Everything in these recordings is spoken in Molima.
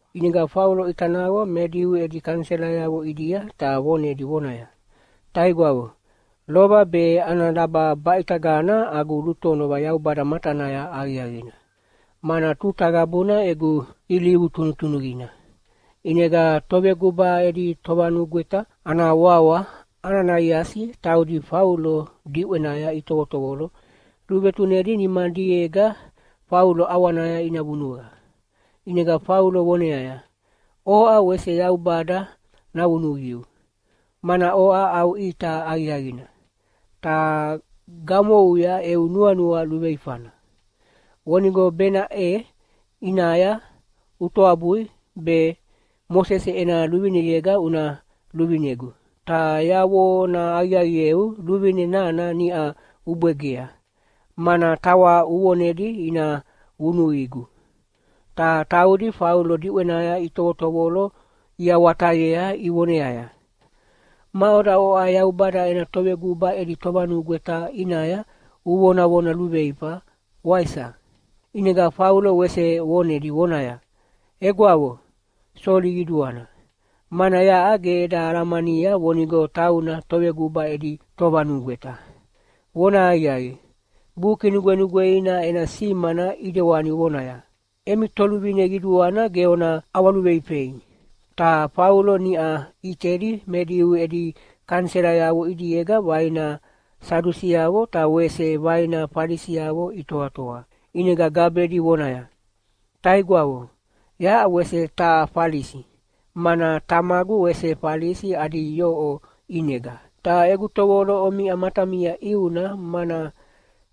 ʼInega Faulo ʼita naqo me Diu edi kaniselayavo ʼidia ta vonedi vonaya, “Taigwavo, lova be ana laba baʼitagana agu lutonova Yaubada matanaya aqiaqina, mana tuta qabuna egu ilivu tunutunuqina.” ʼInega toveguba edi tovanugweta ana wawa Ananaiasi taudi Faulo diʼwenaya itovotovolo luvetunedi nimadiega Faulo ʼawanaya ina vunuqa. ʼInega Faulo voneaya, “Oʼa wese Yaubada navunuqiu, mana oʼa au ʼita aqiaqina, ta gamouya eu nuanua luveifana. Vonigo benaʼe ʼinaya utoabui be Mosese ena luvineyega una luvinegu. Ta yavonahaqiaqieu luvine nana niʼa ubwegea, mana tawa uvonedi ina vunuqigu.” Ta taudi Faulo diʼwenaya itovotovolo iawatayea ivoneaya, “Maʼoda oʼa Yaubada ena toveguba edi tovanugweta ʼinaya uvonavona luveifa, waisa?” ʼInega Faulo wese vonedi vonaya, “Egwavo, soli qiduana, mana yaʼa ge eda alamania vonigo tauna toveguba edi tovanugweta. Vonahaqiaqi, Buki Nugwenugweina ena simana ʼidewani vonaya, ‘Emi toluvine qiduana ge ona ʼawaluveifei.’” Ta Faulo niʼa ʼitedi me Diu edi kaniselayavo ʼidiega vaina Sadusiavo ta wese vaina Falisiavo itoatoa, ʼinega gabedi vonaya, “Taigwavo, yaʼa wese taha Falisi, mana tamagu wese Falisi adi yoʼo ʼinega. Ta egu tovolo omiʼa matamia ʼiuna, mana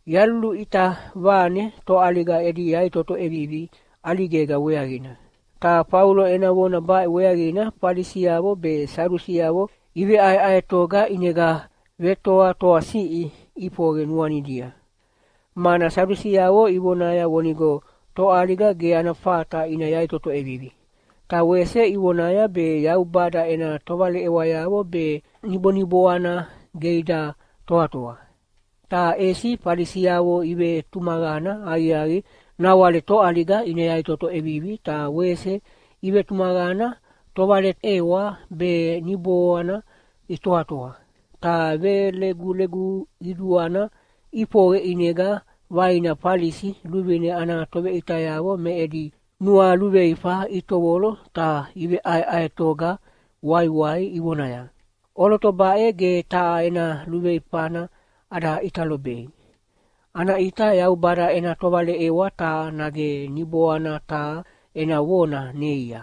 yaluluʼita vane toʼaliga edi yaʼitoto ʼevivi ʼaligega weaqina.” Ta Faulo ena vona baʼe weaqina Falisiavo be Sadusiavo iveʼaeʼaetoga ʼinega vetoatoasiʼi ʼifoqe nuanidia. Mana Sadusiavo ivonaya vonigo toʼaliga ge ana fata ina yaʼitoto ʼevivi. Ta wese ivonaya be Yaubada ena tovaleʼewayavo be niboniboana ge ida toatoa. Ta ʼesi Falisiavo ivetumaqana aqiaqi nawale toʼaliga ina yaʼitoto ʼevivi ta wese ivetumaqana tovaleʼewa be niboana itoatoa. Ta velegulegu qiduana ʼifoqe ʼinega vaina Falisi luvine ana toveʼitayavo me edi nualuveifa itovolo ta iveʼaeʼaetoga waiwai ivonaya, “ʼOloto baʼe ge taha ena luveifana ada ʼita lobei. Ana ʼita Yaubada ena tovaleʼewa taha nage niboana taha ena vona neia.”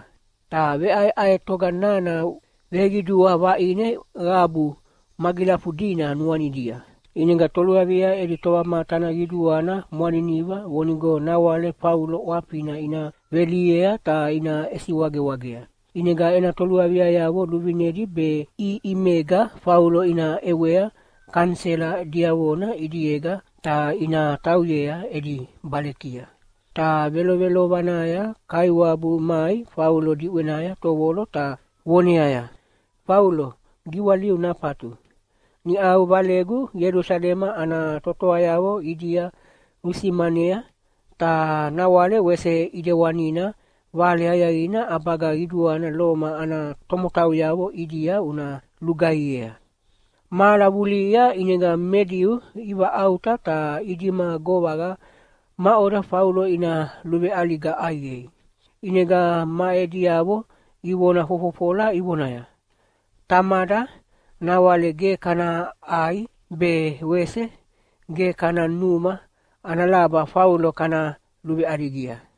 Ta veʼaeʼaetoga nana veqidua vaʼine qabu magilafudina nuanidia, ʼinega toluavia edi tovamatana qiduana mwaniniva vonigo nawale Faulo ʼwafina ina velihiea ta ina ʼesiwagewagea. ʼInega ena toluaviayavo luvinedi be ʼiʼimega Faulo ina ʼewea kanisela diavona ʼidiega ta ina tauyea edi balekia. Ta velovelovanaya Kaiwabu mai Faulo diʼwenaya tovolo ta voneaya, “Faulo, giwaliu nafatu! Niʼau Valegu Ielusalema ana totoayavo ʼidia usimanea, ta nawale wese ʼidewanina Vale Aqiaqina ʼabaga qiduana Loma ana tomotauyavo ʼidia una lugaihiea.” Mahala vulihia ʼinega me Diu ivaʼauta ta idima govaqa maʼoda Faulo ina luveʼaliga ʼaiqei. ʼInega ma ediavo ivona fofofola ivonaya, “Tamada, nawale ge kana ʼai be wese ge kana numa ana laba Faulo kana luveʼaligia!”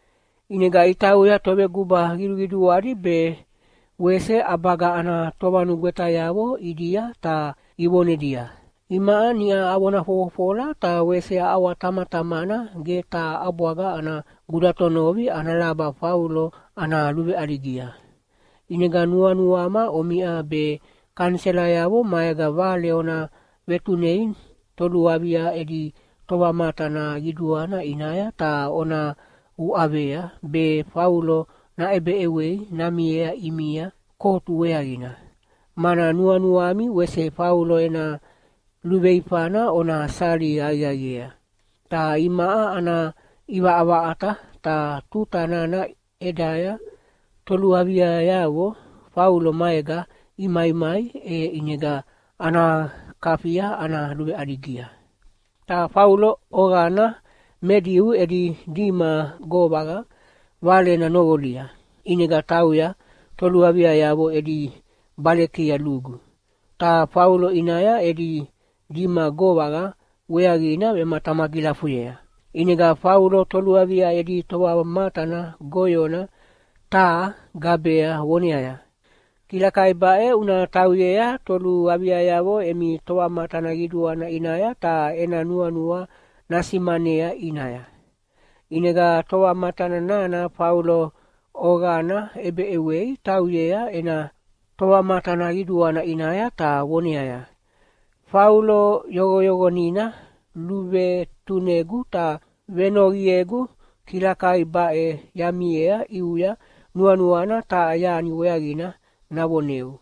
ʼInega itauya toveguba qiduqiduadi be wese ʼabaga ana tovanugwetayavo ʼidia ta ivonedia, “Imaʼa niʼa avona fofofola ta wese aʼawatamatamana ge taha ʼabwaga ana gudatonovi ana laba Faulo ana luveʼaligia. ʼInega nuanuama omiʼa be kaniselayavo maega vale ona vetunei toluavia edi tovamatana qiduana ʼinaya ta ona uʼavea be Faulo naʼebeʼewei namiea ʼimia kotu weaqina, mana nuanuami wese Faulo ena luveifana ona sali aqiaqiea. Ta imaʼa ana ʼivaʼavaʼata, ta tuta nana ʼedaya toluaviayavo Faulo maega imaimai, e ʼinega ana kafia ana luveʼaligia.” Ta Faulo oqana me Diu edi dima govaqa valena noqolia, ʼinega tauya toluaviayavo edi balekia lugu, ta Faulo ʼinaya edi dima govaqa weaqina vematamagilafuyea. ʼInega Faulo toluavia edi tovamatana goyona taha gabea voneaya, “Kilakai baʼe una tauyea toluaviayavo emi tovamatana qiduana ʼinaya ta ena nuanua nasimanea ʼinaya.” ʼInega tovamatana nana Faulo oqana ʼebeʼewei tauyea ena tovamatana qiduana ʼinaya ta voneaya, “Faulo yoqoyoqonina luvetunegu ta venoqiegu kilakai baʼe yamiea ʼiuya nuanuana taha yani weaqina navoneu.”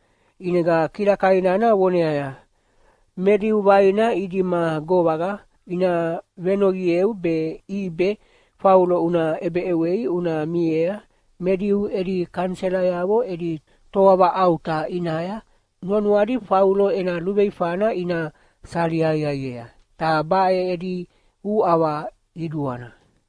ʼInega kilakai nana voneaya, “Me Diu vaina idima govaqa ina venoqieu be ʼibe Faulo una ʼebeʼewei una miea me Diu edi kaniselayavo edi toavaʼauta ʼinaya nuanuadi Faulo ena luveifana ina sali aqiaqiea. Ta baʼe edi uʼava qiduana.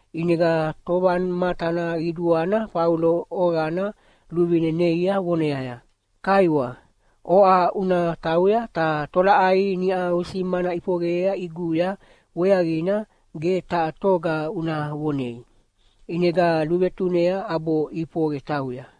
ʼInega tovamatana qiduana Faulo oqana luvine neia voneaya, “Kaiwa, oʼa una tauya ta tolaʼai niʼa usimana ʼifoqeyea ʼiguya weaqina ge taha toga una vonei.” ʼInega luvetunea ʼabo ʼifoqe tauya.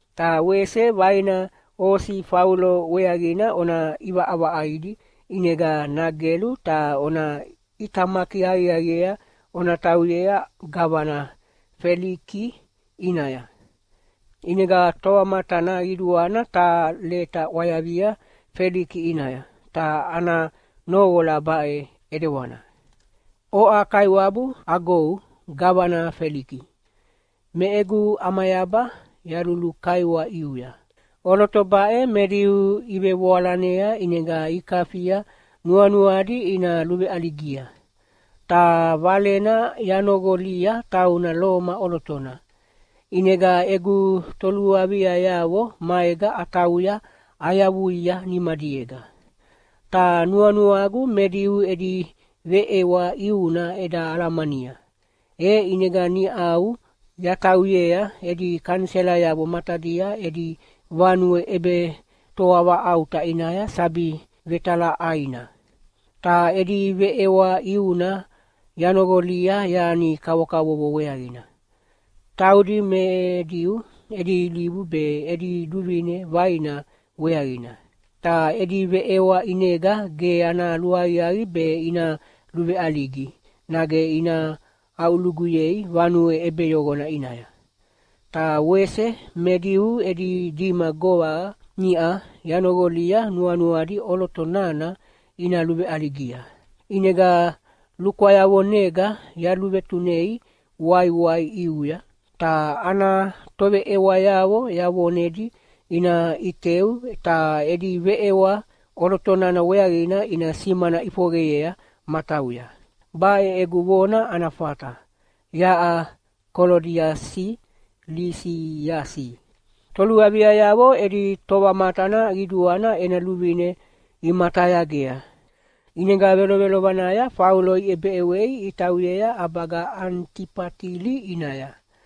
Ta wese vaina osi Faulo weaqina ona ʼivaʼavaʼaidi ʼinega nagelu ta ona ʼitamaki aqiaqiea ona tauyea gavana Feliki ʼinaya.” ʼInega tovamatana qiduana taha leta ʼwayavia Feliki ʼinaya, ta ana noqola baʼe ʼidewana, “Oʼa kaiwabu agou gavana Feliki, me egu ʼamayaba yalulukaiwa ʼiuya. ʼOloto baʼe me Diu ivevoalanea ʼinega ikafia nuanuadi ina luveʼaligia. Ta valena yanoqolia tauna Loma ʼolotona, ʼinega egu toluaviayavo maega atauya ayavuia nimadiega. Ta nuanuagu me Diu edi veʼewa ʼiuna eda alamania, e ʼinega niʼau yatauyea edi kaniselayavo matadia edi vanue ʼebetoavaʼauta ʼinaya sabi vetalaʼaina. Ta edi veʼewa ʼiuna yanoqolia yani kavokavovo weaqina, taudi me Diu edi ilivu be edi luvine vaina weaqina. Ta edi veʼewa ʼinega ge ana luaqiaqi be ina luveʼaligi nage ina aʼuluguyei vanue ʼebeyoqona ʼinaya. Ta wese me Diu edi dima govaqa niʼa yanoqolia nuanuadi ʼoloto nana ina luveʼaligia. ʼInega lukwayavonega yaluvetunei waiwai ʼiuya. Ta ana toveʼewayavo yavonedi ina ʼiteu ta edi veʼewa ʼoloto nana weaqina ina simana ʼifoqeyea matauya. Baʼe egu vona ana fata. Yaʼa Kolodiasi Lisiasi.” Toluaviayavo edi tovamatana qiduana ena luvine imatayagea. ʼInega velovelovanaya Faulo iʼebeʼewei itauyea ʼabaga Anitifatili ʼinaya.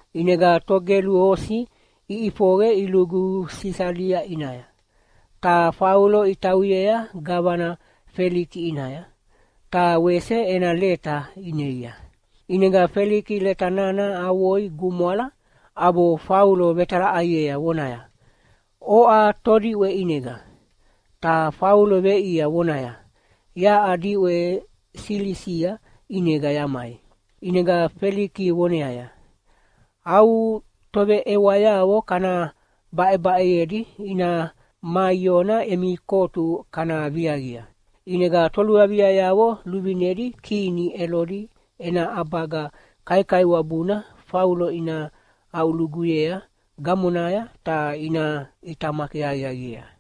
ʼInega togelu osi iʼifoqe ilugu Sisalia ʼinaya. Ta Faulo itauyea gavana Feliki ʼinaya, ta wese ena leta ineia. ʼInega Feliki leta nana avoi gumwala ʼabo Faulo vetalaʼaiea vonaya, “Oʼa todiʼwe ʼinega?” Ta Faulo veʼiea vonaya, “Yaʼa diʼwe Silisia ʼinega yamai.” ʼInega Feliki voneaya, “Au toveʼewayavo kana baʼebaʼeyedi ina maiona emi kotu kana viaqia.” ʼInega toluaviayavo luvinedi kini Elodi ena ʼabaga kaikaiwabuna Faulo ina aʼuluguyea gamonaya, ta ina ʼitamaki aqiaqiea.